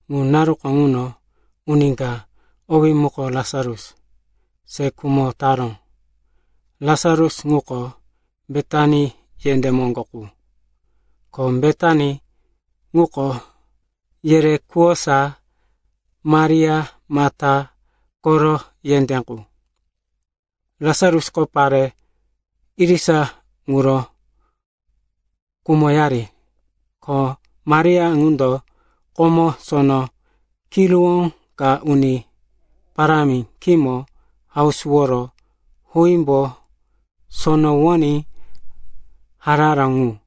Ŋu naru kano uni ka, owí muko Lasarus, se khumo taró. Lasarus ŋuko Betani yendé moŋgo qu, ko Betani ŋuko yerekuwosa Maria, Mata koro yendé ŋu. Lasarusko pare irisa ŋuro kumoyari, ko Maria ŋundo komo sono kiruwó ka Uni Parámi khímo hausuworo huímbo sonowoní hararó ŋu.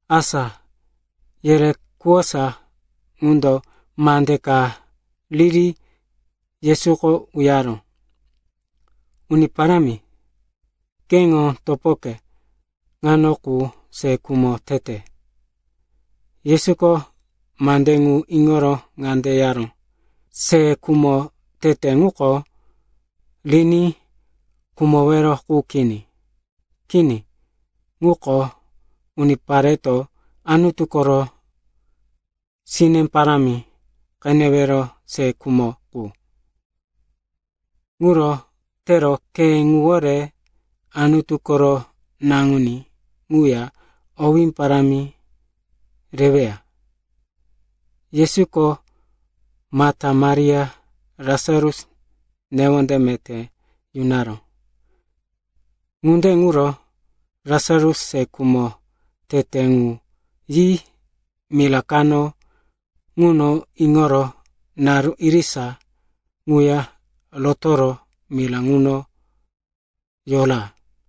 Asa yerekuwosa ŋundo mande ka riri Yesuko uyaró, “Uni Parámi, keŋo topoke ŋano qu se khumo tete.” Yesuko mande ŋu iŋoro ŋande yaró, “Se khumo tete ŋuko riní khumowero qu kini. Kini, ŋuko unipareto Anutu koro sine parámi qenewero se khumo qu. Ŋuro tero khe ŋuwore Anutu koro Naŋuní ŋuya owé parámi reweya.” Yesuko Mata, Maria, Lasarus newonde meté yunaró. Ŋunde ŋuro Lasarus se khumo tete ŋu yi mira kano ŋuno iŋoro naru irisa ŋuya rotoro mira ŋuno yora.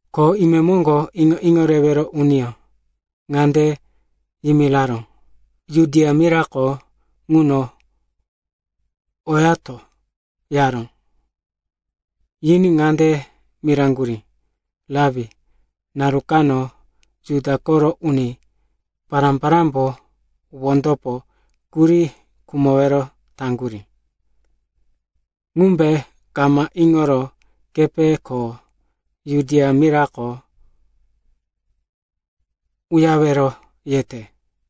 Ko imemoŋgo iŋo-iŋo rewero uniyó ŋande yimiraró, “Judia mirako ŋuno oyato,” yaró. Yiní ŋande miraŋgurí, “Rapi, naru kano Juda koro uni pará-parámbo wondopo kuri khumowero taŋgurí. Ŋumbe kama iŋoro kepe ko Judia mirako uyarewero yete?”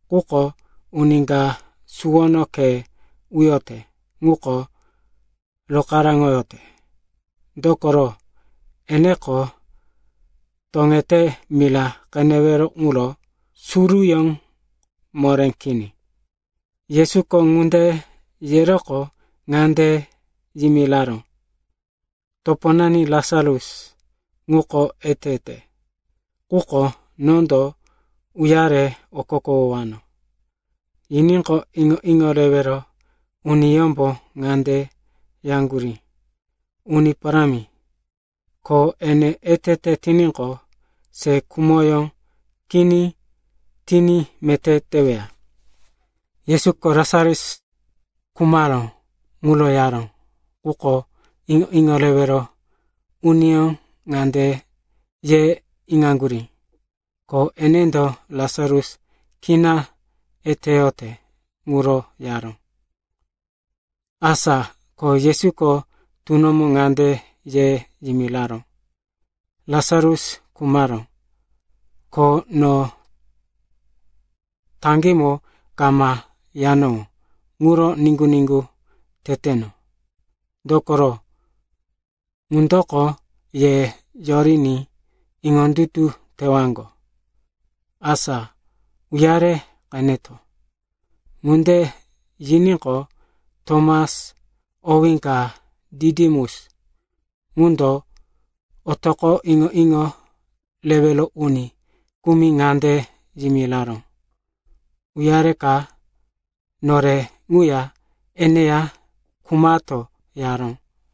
Quko uni ka suwono khe uyote ŋuko rokaráŋoyote, dokoro, eneko toŋete mira qenewero ŋuro suruyó moré kini.” Yesuko ŋunde yeroqo ŋande yimiraró, “Toponani Lasarus ŋuko etete, quko nondo uyare okokowano.” Yiníqo, iŋo-iŋo rewero uniyómbo ŋande yaŋgurí, “Uni Parámi, ko ene etete tiníqo, se khumoyó kini tiní meté teweya.” Yesuko Lasarus khumaró ŋuro yaró, quko iŋo-iŋo rewero uniyó ŋande ye iŋaŋgurí, ko enendo Lasarus kina eteyote ŋuro yaró. Asa ko Yesuko tunomo ŋande ye yimiraró, “Lasarus khumaró. Ko no taŋgímo kama yanowó ŋuro niŋgu-niŋgu teteno. Dokoro, ŋundoko ye yoriní iŋondutu tewaŋgo. Asa uyare qeneto.” Ŋunde yiníqo, Tomas owí ka Ditimus ŋundo otoqo iŋo-iŋo rewero uni kumi ŋande yimiraró, “Uyareka nore ŋuya eneya khumato,” yaró.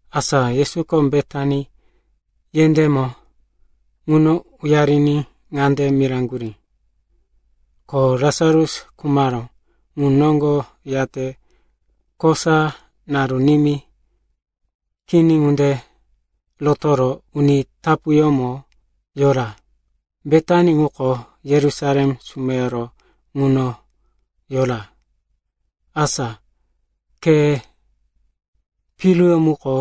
Asa Yesuko Betani yendémo ŋuno uyariní ŋande miraŋgurí, ko Lasarus khumaró ŋu noŋgo yate kosa naru nimí kini ŋunde rotoro uni tapuyómo yora. Betani ŋuko Yerusalem sumeyoro ŋuno yora, asa khe piruyó muko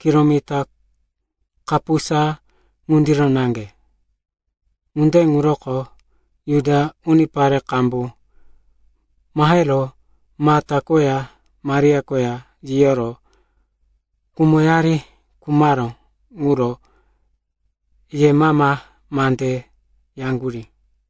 kilomita kapusa ŋundiro naŋge. Ŋunde ŋuroko Juda unipare qambu mahero Mata koya Maria koya yiyoro kumoyari khumaró ŋuro yemama mande yaŋgurí.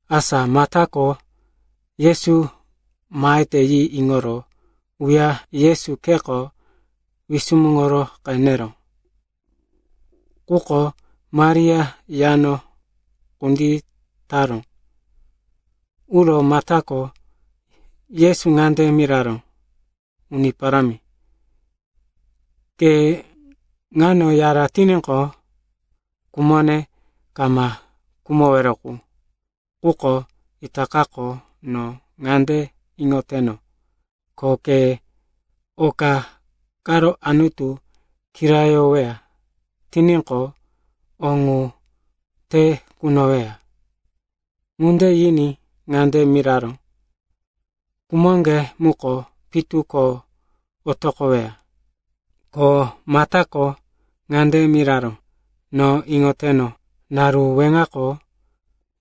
Asa Matako Yesu mahete yi iŋoro uro Yesu kheko wisumuŋo qeneró, quko Maria yano kunditaró. Uro Matako Yesu ŋande miraró, “Uni Parámi, ke ŋano yara tiníqo, kumone kama khumowero qu. Quko itakako no ŋande iŋoteno, ko ke oka karo Anutu kirayoweya tiníqo, o ŋu te kunoweya.” Ŋunde yiní ŋande miraró, “Kumoŋge muko pitu ko otoqoweya.” Ko Matako ŋande miraró, “No iŋoteno, naru weŋako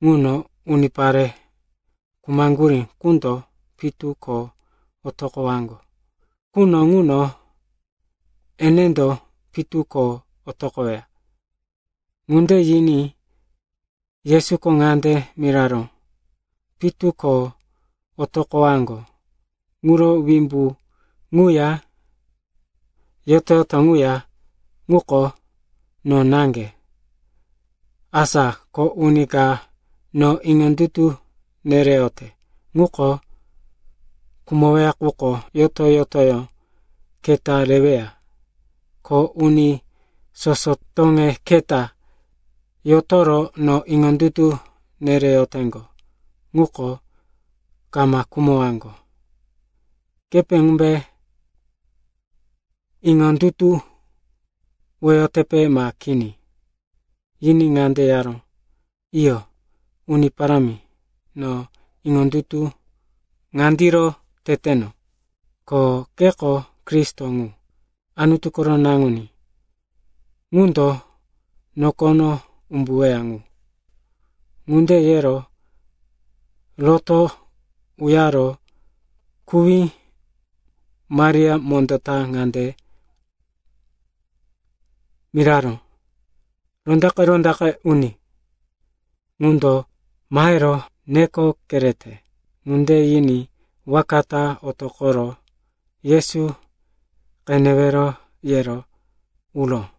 ŋuno unipare khumaŋgurí qundo pitu ko otoqowaŋgo quno ŋuno enendo pitu ko otoqoweya.” Ŋunde yiní Yesuko ŋande miraró, “Pitu ko otoqowaŋgo ŋuro wimbu ŋuya yoto-yoto ŋuya ŋuko no naŋge. Asa ko uni ka no iŋondutu nereyote ŋuko khumoweya quko yoto-yotoyó keta reweya. Ko uni soso toŋe keta yotoro no iŋondutu nereyoteŋgo ŋuko kama khumowaŋgo. Kepe ŋumbe iŋondutuwoyotepe ma kini?” Yiní ŋande yaró, “Iyo, Uni Parámi. No iŋondutu ŋandiro teteno, ko keko Kristo ŋu, Anutu koro Naŋuní ŋundo nokono umbuweya ŋu.” Ŋunde yero roto uyaro kuwí Maria mondó ta ŋande miraró, “Rondaqe-rondaqe Uni ŋundo mahero neko kerete.” Ŋunde yiní waka ta otoqoro, Yesu qenewe, yero uró.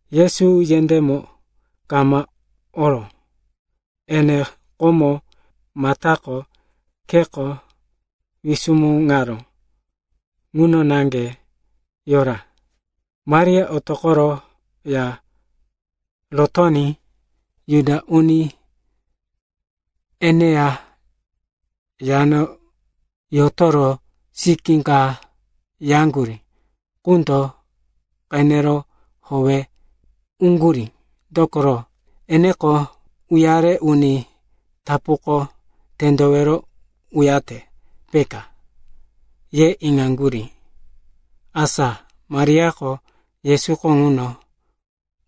Yesu yendémo kama oró. Ene komo Matako kheko wisumuŋaró ŋuno naŋge yora. Maria otoqoro ya rotoní Juda uni eneya yano yotoro sikí ka yaŋgurí qundo qenero howe uŋgurí, dokoro, eneko uyare uni tapuko tendowero uyate, peka, ye iŋaŋgurí. Asa Mariako Yesuko ŋuno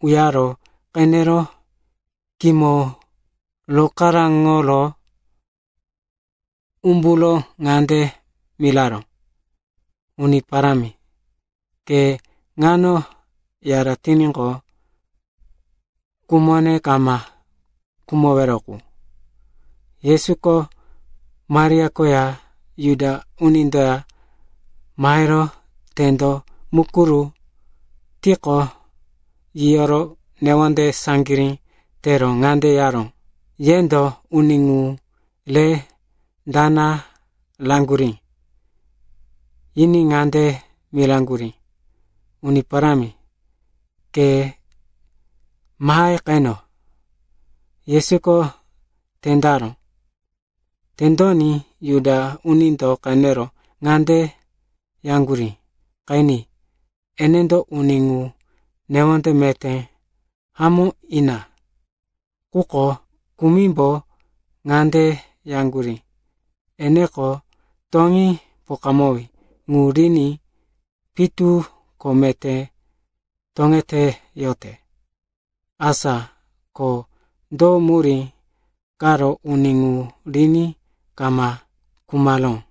uyaro qenero khímo rokaraŋo umburo ŋande miraró, “Uni Parámi, ke ŋano yara tiníqo, kumone kama khumowero qu.” Yesuko Maria koya Juda unindoya mahero tendo mukuru tiqo, yiyoro newonde saŋgirí tero ŋande yaró, “Yendo uni ŋu re dana raŋgurí?” Yiní ŋande miraŋgurí, “Uni Parámi, ke mahe qeno.” Yesuko tendaró. Tendoní Juda unindo qenero ŋande yaŋgurí, “Qeni. Enendo uni ŋu newonde meté hamó ina.” Quko kumimbo ŋande yaŋgurí, “Eneko toŋí pokawí ŋu riní pitu ko meté toŋeteyote. Asa ko do murí karo uni ŋu riní kama khumaró?”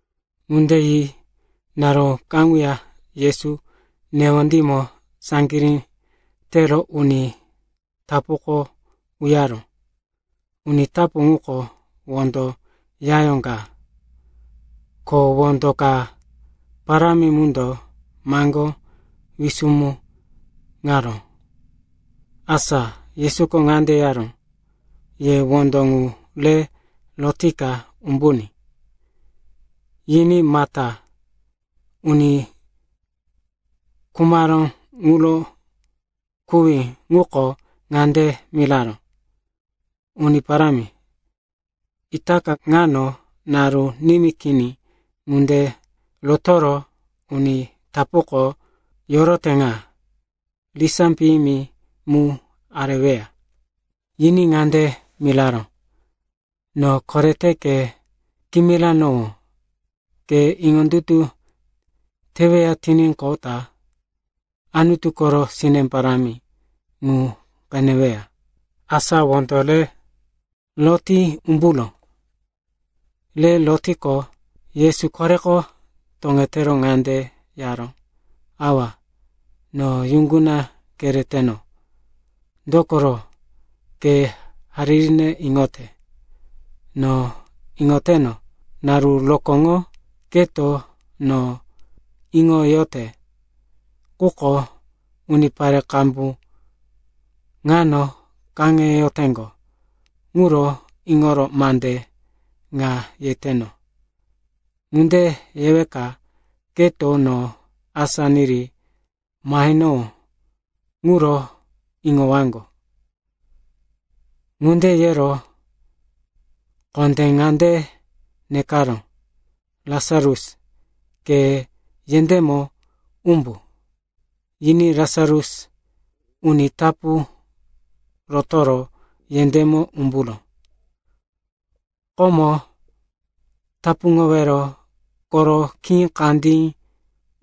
Ŋunde yi naru kaŋuya Yesu newondímo saŋgirí tero uni tapuko uyaró. Uni tapu ŋuko wondo yayó ka, ko wondo ka parámi mundo maŋgó wisumuŋaró. Asa Yesuko ŋande yaró, “Ye wondo ŋu re rotika umbuní.” Yiní Mata, uni khumaró ŋuro kuwí ŋuko ŋande miraró, “Uni Parámi, itaka ŋano naru nimí kini ŋunde rotoro uni tapuko yorote ŋa. Risá piyimi mu areweya.” Yiní ŋande miraró, “No korete ke kimiranowó, ke iŋondutu teweya tiníqo, Anutu koro sine parámi ŋu qeneweya.” Asa wondo re roti umburó. Re rotiqo, Yesu koreko toŋetero ŋande yaró, “Awa, no yuŋguna kereteno, dokoro, ke haririne iŋote. No iŋoteno, naru rokóŋo keto no iŋoyote. Quko unipare qambu ŋano kaŋeyoteŋgo ŋuro iŋoro mande ŋa yeteno. Ŋunde yeweka keto no asá niri mahenowó ŋuro iŋowaŋgo.” Ŋunde yero kondé ŋande nekaró, “Lasarus, ke yendémo umbu.” Yiní Lasarus uni tapu rotoro yendémo umburó. Komo tapuŋowero koro khí kandí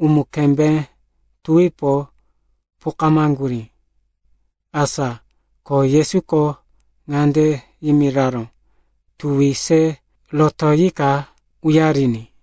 umu-kembé tuwipo pokamaŋgurí. Asa ko Yesuko ŋande yimiraró, “Tuwi se rotoyika uyariní.”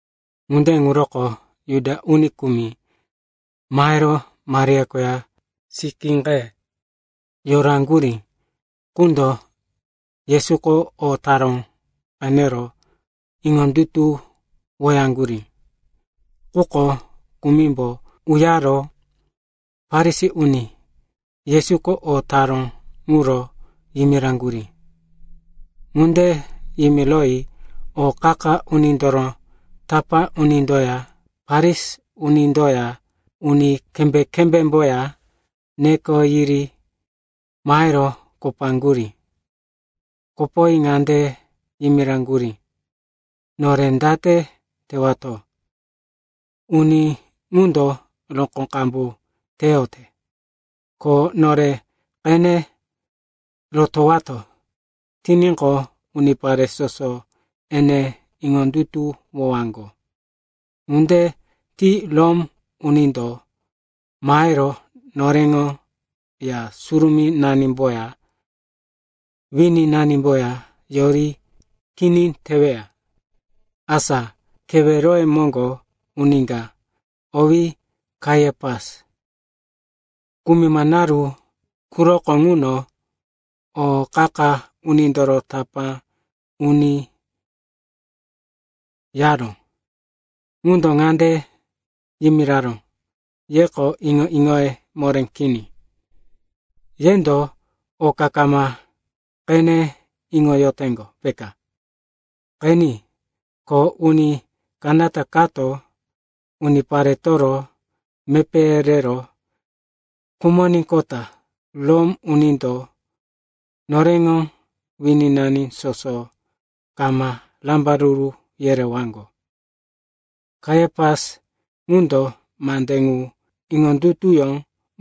Ŋunde ŋuroko Juda uni kumi mahero Maria koya sikí ka yoraŋgurí qundo Yesuko o taró qenero iŋondutuwoyaŋgurí. Quko kumimbo uyaro Farisi uni Yesuko o taró ŋuro yimiraŋgurí. Ŋunde yimiroyi o qa-qa unindoro tapá unindoya Farisi unindoya uni kembé-kembémboya neko yiri mahero kopaŋgurí. Kopoyi ŋande yimiraŋgurí, “Nore date tewato? Uni ŋundo rokó qambu teyote. Ko nore qene rotowato tiníqo, unipare soso ene iŋondutuwowaŋgo. Ŋunde ti Rom unindo mahero noreŋo Ya Surumínanimboya, wininanimboya yori kini teweya.” Asa keweroye moŋgo uni ka, owí Kaiapas, kumima naru quroko ŋuno o qa-qa unindoro tapá uni yaró, ŋundo ŋande yimiraró, “Yeko iŋo-iŋoye moré kini. Yendo oka kama qene iŋoyoteŋgo, peka. Qeni, ko uni kanata kato uniparetoro mepéye rero khumoníqota Rom unindo noreŋo wininani soso kama rambaruru yerewaŋgo.” Kaiapas ŋundo mande ŋu iŋondutuyó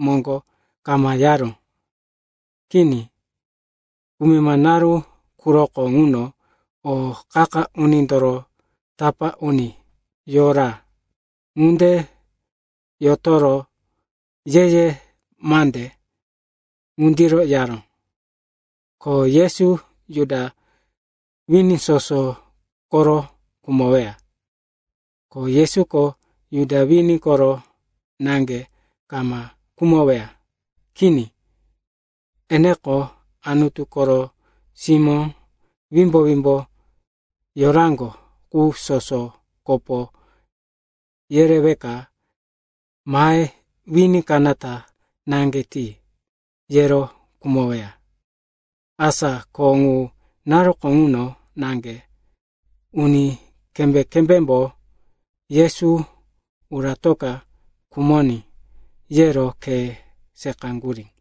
moŋgo kama yaró. Kini. Kumima naru quroko ŋuno o qa-qa unindoro tapá uni yora. Ŋunde yotoro ye-ye mande ŋundiro yaró, ko Yesu Juda wini soso koro khumoweya. Ko Yesuko Juda wini koro naŋge kama khumoweya. Kini. Eneko, Anutu koro simó wimbo-wimbo yoraŋgo qu soso kopo yereweka mahe wini kanata naŋge ti, yero khumoweya. Asa ko ŋu naruko ŋuno naŋge uni kembé-kembémbo, Yesu uratoka khumoní, yero khe seqaŋgurí.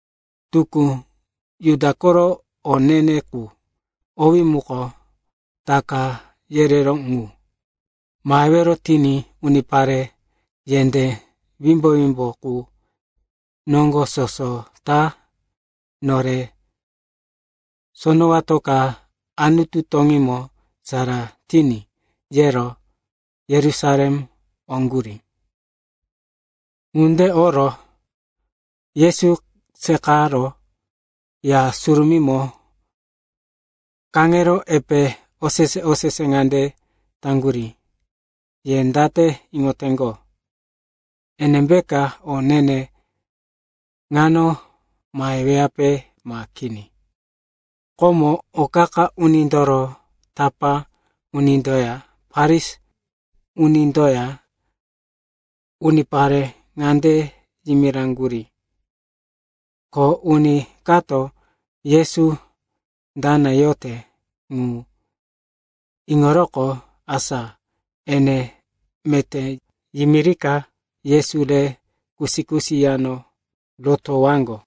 Tukú Juda koro o ne-ne ŋu, owí muko Taka yereró ŋu mahewero tiní unipare yendé wimbo-wimbo qu noŋgo soso ta, nore sonowatoka Anutu toŋímo sara tiní, yero Yerusalem oŋgurí. Ŋunde oro Yesu seqaro Ya Surumímo kaŋero epe osese-osese ŋande taŋgurí, “Ye date iŋoteŋgo? Enembe o ne-ne ŋano maheweyape ma kini?” Komo o qa-qa unindoro tapá unindoya Farisi unindoya unipare ŋande yimiraŋgurí, ko uni kato Yesu dana yote ŋu iŋoroqo, asa ene meté yimirika Yesu re kusi-kusi yano rotowaŋgo.